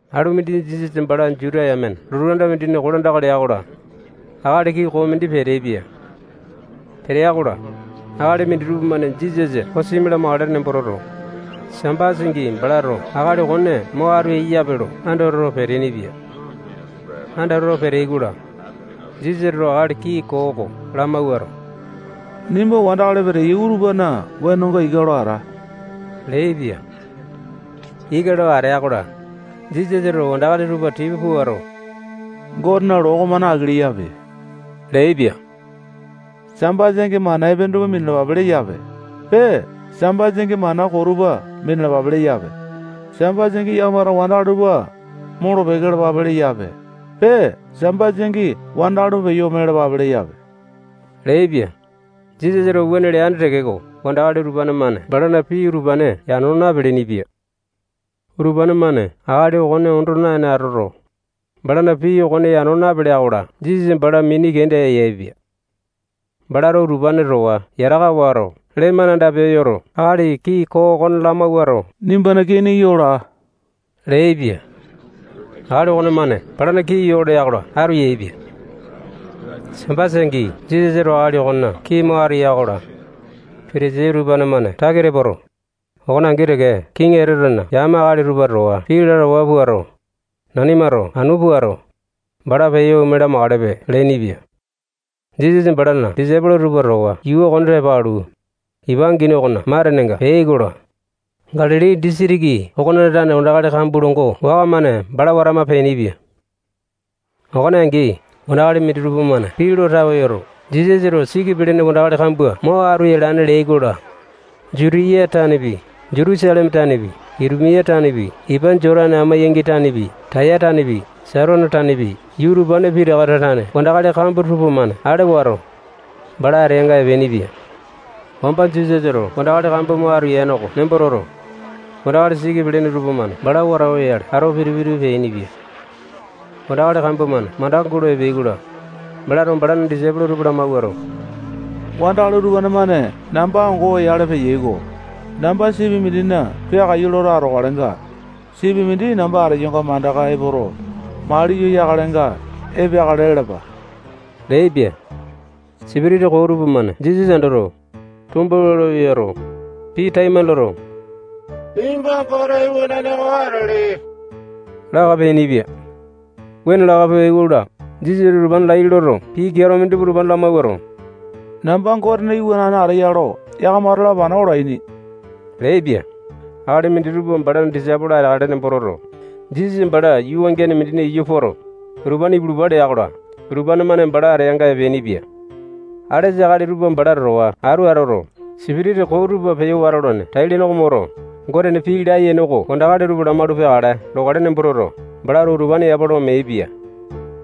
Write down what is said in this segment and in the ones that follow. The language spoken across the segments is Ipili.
Alu mindi Jisasa bala Juta yamena lotu anda mindina kolandaka lea-kola, akali kii koo mindi peteaipia. Petea-kola, akali minditupa-mane Jisasa kosimi lamakale nembo toto, Sambasa angi balato akali okone mo atu eyape lo andatawa peteaini-pia. Andatawa peteai-kola, Jisasato akali kii koo oko lamawuato, nimba wandakali peteyai utupana wenonga ika lo ata leaipia. Ika lo atea-kola, Jisasato wandakali tupa tipa puato, Gotena loo okomane aki leyape leaipia. Sambasa angi mana epene tupa minalapape leyape. Pee, Sambasa angi, mana koo tupa minalapape leyape. Sambasa angi yakamato wandakali tupa molo-peke lalapape leyape. Pee, Sambasa angi wandakali tupa peyo ome lalapape leyape leaipia. Jisasato wuane leane tekeko, wandakali utupane-mane balana pii utupane yano napeleaini-pia. Utupane-mane akali okone ondo naene atoto, balana pii okone yano napeleai-kola, Jisasa bala mini kenda yaepia. Balato utupane towa yataka wato, lee-mane anda peyoto, akali kii koo okone lamawuato, nimbana kini yo laa leaipia. Akali okomane balana kini yo lea-kola, atu yaepia. Sambasa angi Jisasato akali okonena kini mo atu ya-kola, Patasai tupamane takita poto, okone angi teke kiŋi Etotena yame akali tupa towa pii lalawa puato, nanimato anu puato, bala peyo ome lamakalepe leainipia. Jisasa balana disaipolo tupa towa yuu okone tepa alu, ipa angini okona matenenga peai-kola, Galili disitiki okona tane wandakali kambua longo waka-mane bala watama peainipia. Okone angi, wandakali minditupa-mane pii lo tawe yoto, Jisasato siki pelene wandakali kambua mo atu yalane leai-kola, Jutiya tanepi, Jutusaleme tanepi, Itumia tanepi, ipa Jotane amo-yangi tanepi, Taya tanepi, Saitone tanepi, yuu utupane pitakana tane wandakali kambua tupamane ale wato, bala ateanga epeainipia. Wamba Jisasato wandakali kambua mo atu yane oko nembo toto, wandakali siki pelene tupamane bala wata oyale ato pitu-pitu peainipia. Wandakali kambua-mane mandaka gulo epeai-kola, balato balana disaipolo tupa lamawuato, wandakali utupane-mane namba ango oyale peyai-ko. Namba sipi mindina peakaiyu loto atokalenga, sipi mindi namba ateyonga mandaka epoto, mali yo yakalenga, epeakale lalapa leaipia. Sipitisa koo tupamane Jisasa andoto, tombawua lo yoto, pii taimane loto, nimba Gote iwanane oko atele laka peainipia. Wuane laka peai-kola, Jisasato utupane laiya loto, pii keato mindi utupane lamawuato, namba Gotena Iwanane ateya lo yakamato lapana olaini leaipia. Akali minditupa balana disaipolo ateakale nembo toto, Jisasa bala yuu wangiane mindina iyu poto, utupane ipulupa lea-kola, utupane-mane bala ateanga epeainipia. Alesa akali tupa bala towa atu atoto, sipitisa koo tupa peyo watolane tai-lene oko moto, Gotena pii layene oko wandakali tupa lamaulu peakale lokale nembo toto, balato utupane yapa lo meaipia.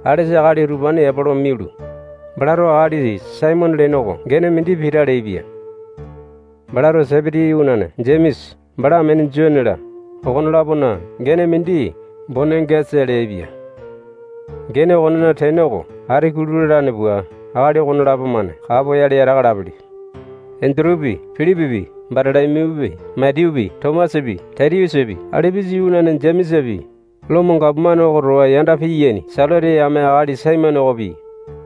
Alesa akali utupane yapa lo mialu, balato akali Saimone lene oko gene mindi Pita leaipia. Balato Sepiti iwanane Jemesa, bala amene Jone-la, okone-lapona gene mindi Bonengesa leaipia. Gene okonena tene oko, ati kulu lalane pua, akali okonelapo-mane kapoyale yataka alapele. Endutupi, Pilipipi, Batolo-miyupi, Matiyupi, Tomasapi, Tatiyusapi, Alipusa iwanane Jemesapi, Lomo gapomane oko towa yanda piyaini Selote yame akali Saimone okopi,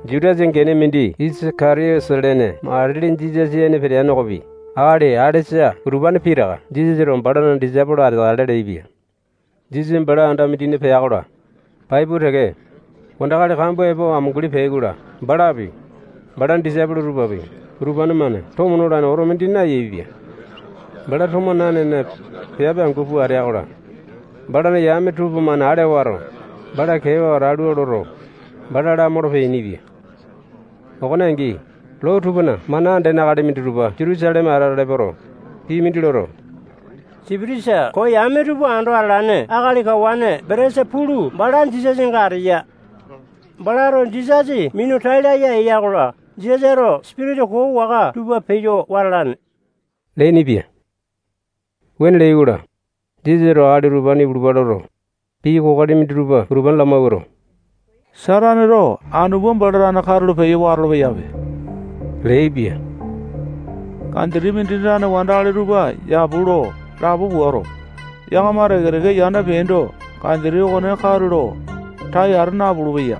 Jutasa gene mindi Isaka-tiyote lene matili Jisasa ene peteane okopi, akali alesa utupane pitaka Jisasato balana disaipolo ateakale leaipia. Jisasa bala anda mindina pea-kola, pai pua teke, wandakali kambua epo amunguli peai-kola, balapi, balana disaipolo tupapi, utupane-mane tomo nolane oto mindi nayaepia. Bala tomo nanene, piape angu pua ateya-kola, balana yame tupamane ale wato, bala keewa atalua loto, bala lamolo peainipia. Okone angi, loo tupana mana andene akali minditupa Jutusaleme atala epoto, pii mindi loto, sipitisa koo yame tupa ando atalane akali kawane Belesa-pulu bala Jisasanga ateya. Balato Jisasa minu tai laya eya-kola, Jisasato sipitisa koo waka tupa peyo wata alane leainipia. Wuane leai-kola, Jisasato akali utupane ipulupa loto, pii kokoli minditupa utupane lamawuato, Sataneto anu pua, bala tane katulo peyo watolo-peyape leaipia. Kanjiti mindina tane wandakali tupa yapu lo lapo puato, yakama teke-teke yanda peaindo, kanjiti okone katulo tai ata napulu-peya.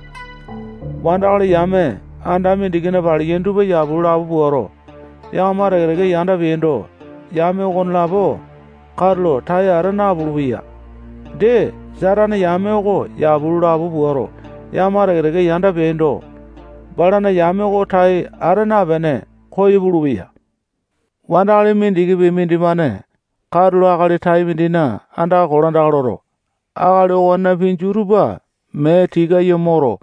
Wandakali yame anda mindikina paliyaini tupa yapu lo lapo puato, yakama teke-teke yanda peaindo, yame okonelapo katulo tai ata napulu-peya. Dee, Satane yame oko yapu lo lapo puato, yakama teke-teke yanda peapindo, balana yame okone tai ata napene, koyo pulupeya. Wandakali mindikipi mindimane katulo akali tai mindina andaka kolandaka loto, akali okonena pinju tupa mee tikayo moto,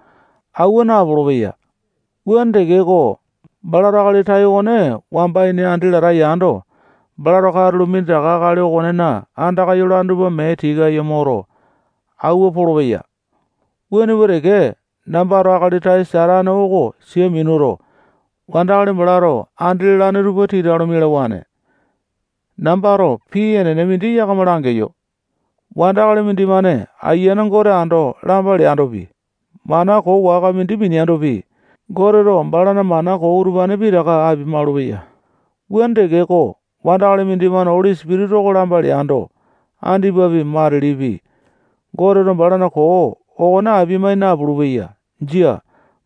awua napolo-peya. Wuane tekeko, balato akali tai okone wamba ini andi lata yando, balato katulo minditaka akali okonena andaka yolane tupa mee tikayo moto, awua polopeya. Wuane pua teke, nambato akali tai Satane oko sia minuto, wandakali balato andi lalane tupa tita lo mialawane. Nambato pii enene mindi yakama langeyo. Wandakali mindimane Ayiane Gote ando lamba leandopi, mana koo waka mindi mineandopi, Goteto balana mana koo utupane pitaka apia-maulupeya. Wuane tekeko, wandakali mindimane Oli Sipitisa oko lamba leando, andipapi, matilipi, Goteto balana koo okone apia-mai napulu-peya. Jia.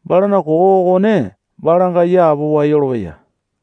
Balana koo okone balanga yapowa yolopeya.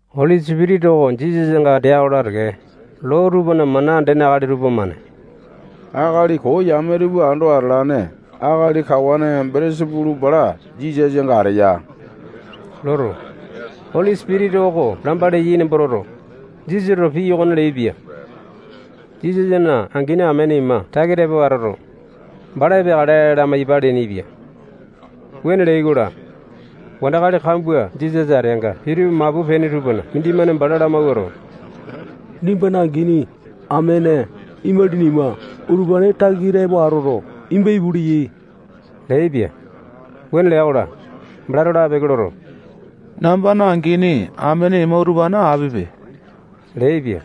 Oli Sipitisa oko Jisasanga atea-kola teke, loo tupana mana andene akali tupamane akali koo yame tupa ando atalane akali kawane Belesa-pulu bala Jisasanga ateya loto, Oli Sipitisa oko lamba leyai nembo toto, Jisasato pii okone leaipia. Jisasana angini amene ima takita epo atoto, bala epeakale lamaiyapa leainipia. Wuane leai-kola, wandakali kambua Jisasa ateanga pitu mapu peaini tupana mindimane bala lamawuato, nimbana angini, amene, imalini ima, utupane takita epo atoto, nimba ipu leyai leaipia. Wuane lea-kola, balato lapeke loto, nambana angini, amene ima, utupane apipe leaipia.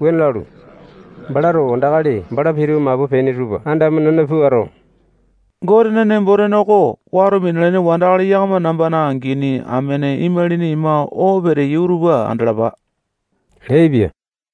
Wuane lalu, balato wandakali bala pitu mapu peaini tupa andamo-nena puato, Gotena nembo-tene oko wato minalaini wandakali yakama nambana angini, amene, imalini ima oo peteyai utupa andalapa leaipia.